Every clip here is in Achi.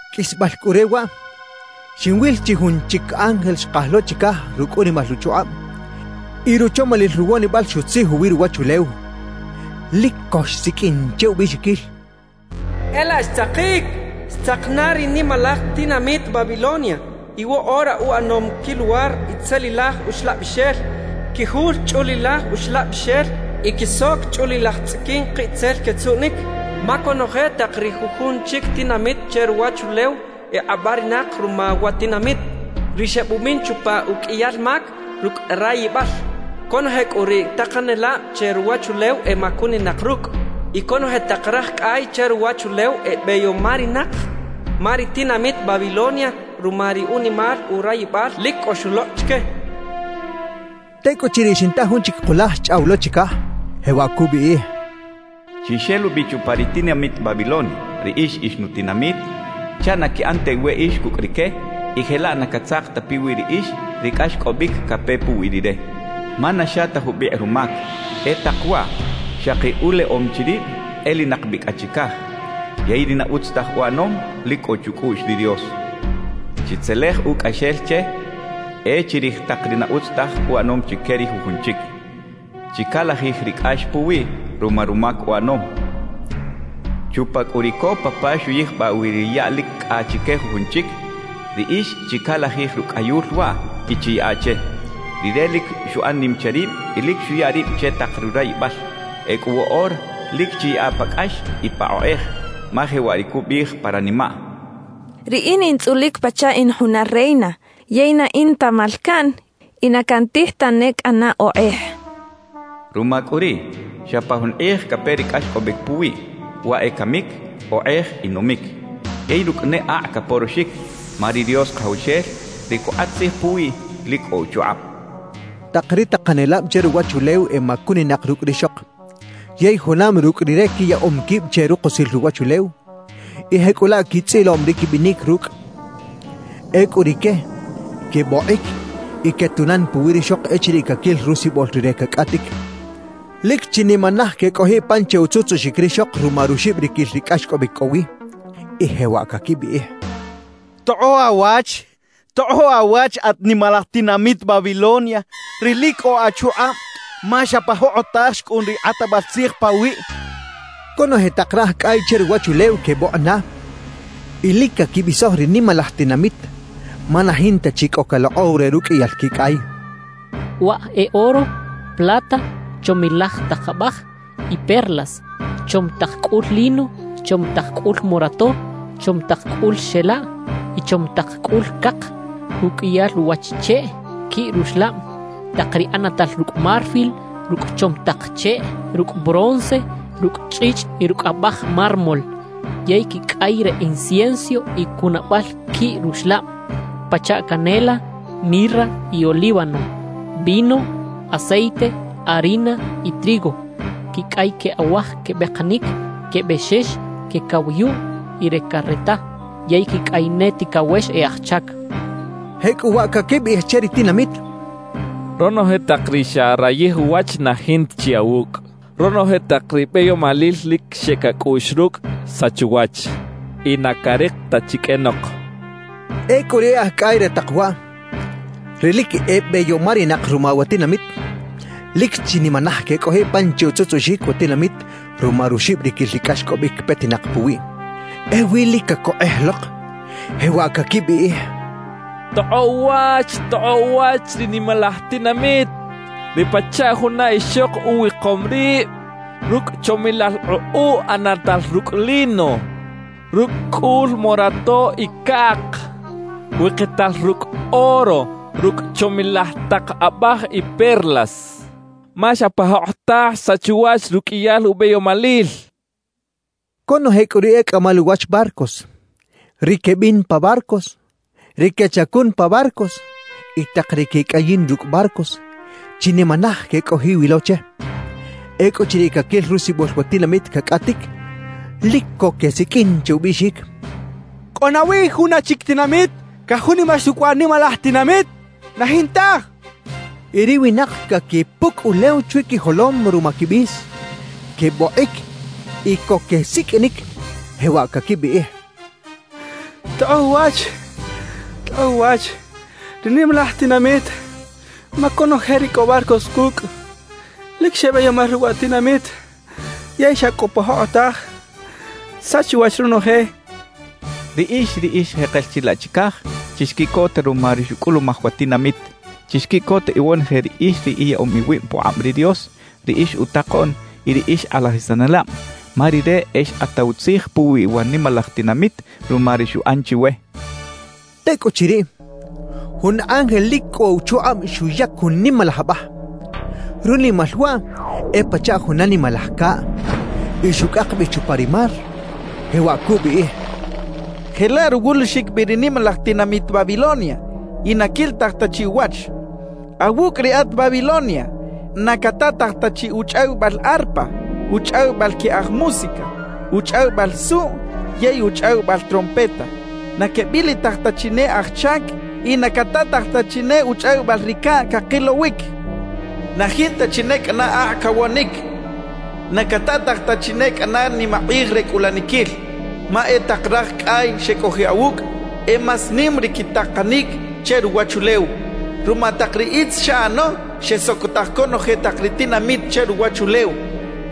Qꞌuisbal cꞌu re waꞌ, xinwil chi jun chic ángel xkaj lo chicaj rucꞌ unimal uchukꞌab; y ruchomalil ruwonibal xutzij uwi ruwachulew. Lic co xsiqꞌuin che ubiꞌxiquil: «¡E laꞌ xtzakic! ¡Xtzak na ri nimalaj tinamit Babilonia! Y woꞌora uꞌanom quiluwar itzelilaj uxlabixel, quijul chꞌulilaj uxlabixel y quisoc chꞌulilaj tzꞌiquin kiꞌtzel quetzuꞌnic. Ma conoje tak ri jujun chic tinamit che ruwachulew ekꞌabarinak ruma wa tinamit, ri xebumin chupa uqꞌuiyal mac rucꞌ rayibal. Conoje cꞌu ri takanelab che ruwachulew emacuninak rucꞌ; y conoje tak raj cꞌay che ruwachulew ebeyomarinak ma ri tinamit Babilonia ruma ri unimal urayibal lic cꞌo xulokꞌ chique» xchaꞌ. Tecꞌuchiriꞌ xinta jun chic kulaj xchꞌaw lo chicaj, jewaꞌ cubiꞌij: «Chixelubi chupa ri tinamit Babilonia, riꞌix ix nutinamit, chaꞌ na quiꞌan ta iweꞌix cucꞌ rique y jelaꞌ na catzak ta piwi riꞌix ri cꞌaxcꞌobic cape puwi rire. Ma na xa ta jubikꞌ rumac, e tak waꞌ xaki uleꞌom chi rib elinak bi cꞌa chicaj. Yey ri na utz taj uꞌanom, lic cꞌo chucꞌuꞌx ri Dios. Chitzelej ucꞌaxel che e chirij tak ri na utz taj uꞌanom chique ri jujun chic; chicalajij ri cꞌax puwiꞌ ruma rumac uꞌanom; chupa cꞌu ri copa pa xuyijbaꞌ wi ri yaꞌ lic cꞌa chique jujun chic, riꞌix chicalajij rucꞌayul waꞌ y chiyaꞌa che. Rire lic xuꞌan nim che rib y lic xuya rib che tak rurayibal; ecꞌu woꞌora lic chiyaꞌa pa cꞌax y pa okꞌej; ma jewaꞌ ri cubiꞌij pa ranimaꞌ: “Riꞌin in tzꞌulic pachaꞌ in juna reina, yey na in ta malcaꞌn y na cantij tane cꞌana okꞌej” cachaꞌ. Ruma cꞌu riꞌ, xa pa jun kꞌij cape ri cꞌaxcꞌobic puwiꞌ: waꞌ e camic, okꞌej y numic; yey rucꞌ ne akꞌ caporoxic, ma ri Dios Kajawxel, ri cukꞌat tzij puwiꞌ, lic cꞌo uchukꞌab» cachaꞌ. Tak ri takanelab che ruwachulew emacuninak rucꞌ rixok, yey junam rucꞌ rire quiyaꞌom quib che rukusil ruwachulew y jecꞌulaꞌ quitzꞌiloꞌm ri quibinic rucꞌ. Ecꞌu rique quebokꞌic y quetunan puwi rixok echiriꞌ caquil rusibol rire cacꞌatic. Lic chinimanaj quecꞌojiꞌ pan che utzutzuꞌxic rixok ruma ruxibriquil ri cꞌaxcꞌobic cꞌo wi y jewaꞌ caquibiꞌij: «¡Tokꞌoꞌ awach! ¡Tokꞌoꞌ awach at nimalaj tinamit Babilonia, ri lic cꞌo achukꞌab, ma xa pa jokꞌotaj xcꞌun ri kꞌatbal tzij pawiꞌ!» quechaꞌ. Conoje tak raj cꞌay che ruwachulew quebokꞌ na y lic caquibisoj ri nimalaj tinamit ma na jinta chi cꞌo calokꞌow re ruqꞌuiyal quicꞌay. Waꞌ e oro, plata, chomilaj tak abaj y perlas; chom tak cꞌul lino, chom tak cꞌul morato, chom tak cꞌul xela y chom tak cꞌul cak; uqꞌuiyal uwach cheꞌ quiꞌ ruxlab; tak ri ꞌanatal rucꞌ marfil, rucꞌ chom tak cheꞌ, rucꞌ bronce, rucꞌ chꞌichꞌ y rucꞌ abaj mármol; yey quicꞌay re incienso y cunabal quiꞌ ruxlab, pachaꞌ canela, mirra y olíbano; vino, aceite, harina y trigo; quicꞌay que awaj quebekanic, que bexex, que cawayuꞌ y re careta; yey quicꞌay ne ticawex e aj chac. Jecꞌuwaꞌ caquibiꞌij che ri tinamit: «Ronoje tak ri xarayij uwach na jinta chi awucꞌ; ronoje tak ri beyomalil lic xeꞌec acꞌuꞌx rucꞌ, xsach uwach y na carik ta chi qꞌuenok» quechaꞌ. Ecꞌu ri e aj cꞌay re tak waꞌ, ri lic ebeyomarinak ruma wa tinamit, lic chinimanaj quecꞌojiꞌ pan che utzutzuꞌxic wa tinamit ruma ruxibriquil ri cꞌaxcꞌobic petinak puwiꞌ. Ewi lic cacokꞌej lok, jewaꞌ caquibiꞌij: «¡Tokꞌoꞌ uwach! ¡Tokꞌoꞌ uwach ri nimalaj tinamit, ri pachaꞌ juna ixok uwikom rib rucꞌ chomilaj ukꞌuꞌ ꞌanatal rucꞌ lino, rucꞌ cꞌul morato y cak; wikital rucꞌ oro, rucꞌ chomilaj tak abaj y perlas! Ma xa pa jokꞌotaj xsach uwach ruqꞌuiyal ubeyomalil» quechaꞌ. Conoje cꞌu ri e cꞌamal uwach barcos, ri quebin pa barcos, ri quechacun pa barcos y tak ri quecꞌayin rucꞌ barcos, chinimanaj quecꞌojiꞌ wi lo che. Ecꞌuchiriꞌ caquil rusibol wa tinamit cacꞌatic, lic co quesiqꞌuin che ubiꞌxic: «¿Cꞌo nawi juna chic tinamit cajunimax rucꞌ wa nimalaj tinamit? ¡Na jintaj!» quechaꞌ. Y ri winak caquipucꞌ ulew chwi quijolom ruma quibis, quebokꞌic y co quesiqꞌuinic, jewaꞌ caquibiꞌij: «¡Tokꞌoꞌ uwach! ¡Tokꞌoꞌ uwach ri nimalaj tinamit! Ma conoje ri cꞌo barcos cucꞌ lic xebeyomar rucꞌ wa tinamit; yey xa cꞌu pa jokꞌotaj xsach uwach ronoje. Riꞌix ri ix jekel chilaꞌ chicaj, chixquiꞌcota ruma ri xucꞌulumaj wa tinamit. Chixquiꞌcot iwonoje riꞌix ri iyaꞌom iwib pukꞌab ri Dios, ri ix utakoꞌn y ri ix kꞌalajisanelab, ma Rire e xkꞌataw tzij puwi wa nimalaj tinamit ruma ri xuꞌan chiwe» quechaꞌ. Tecꞌuchiriꞌ, jun ángel lic cꞌo uchukꞌab xuyac jun nimalaj abaj, runimal waꞌ e pachaꞌ juna nimalaj caꞌ, y xucꞌak bi chupa ri mar, jewaꞌ cubiꞌij: «Jelaꞌ ruwulixic bi ri nimalaj tinamit Babilonia y na quilitaj ta chi uwach. »Awucꞌ riꞌat Babilonia, na catataj ta chi uchꞌawibal arpa, uchꞌawibal que aj música, uchꞌawibal suꞌ yey uchꞌawibal trompeta; na quebilitaj ta chi ne aj chac y na catataj ta chi ne uchꞌawibal ri caꞌ cakilowic. Na jinta chi ne cꞌana akꞌ cawonic, na catataj ta chi ne cꞌana nimakꞌij re cꞌulaniquil. Ma e tak raj cꞌay xecꞌojiꞌ awucꞌ, e más nim ri quitakanic che ruwachulew. Ruma tak ri itz xaꞌano, xesocotaj conoje tak ri tinamit che ruwachulew.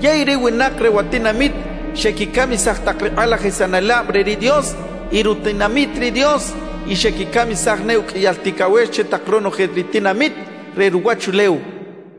Yey ri winak re wa tinamit xequicamisaj tak ri kꞌalajisanelab re ri Dios y rutinamit ri Dios, y xequicamisaj ne uqꞌuiyal ticawex che tak ronoje ri tinamit re ruwachulew» cachaꞌ.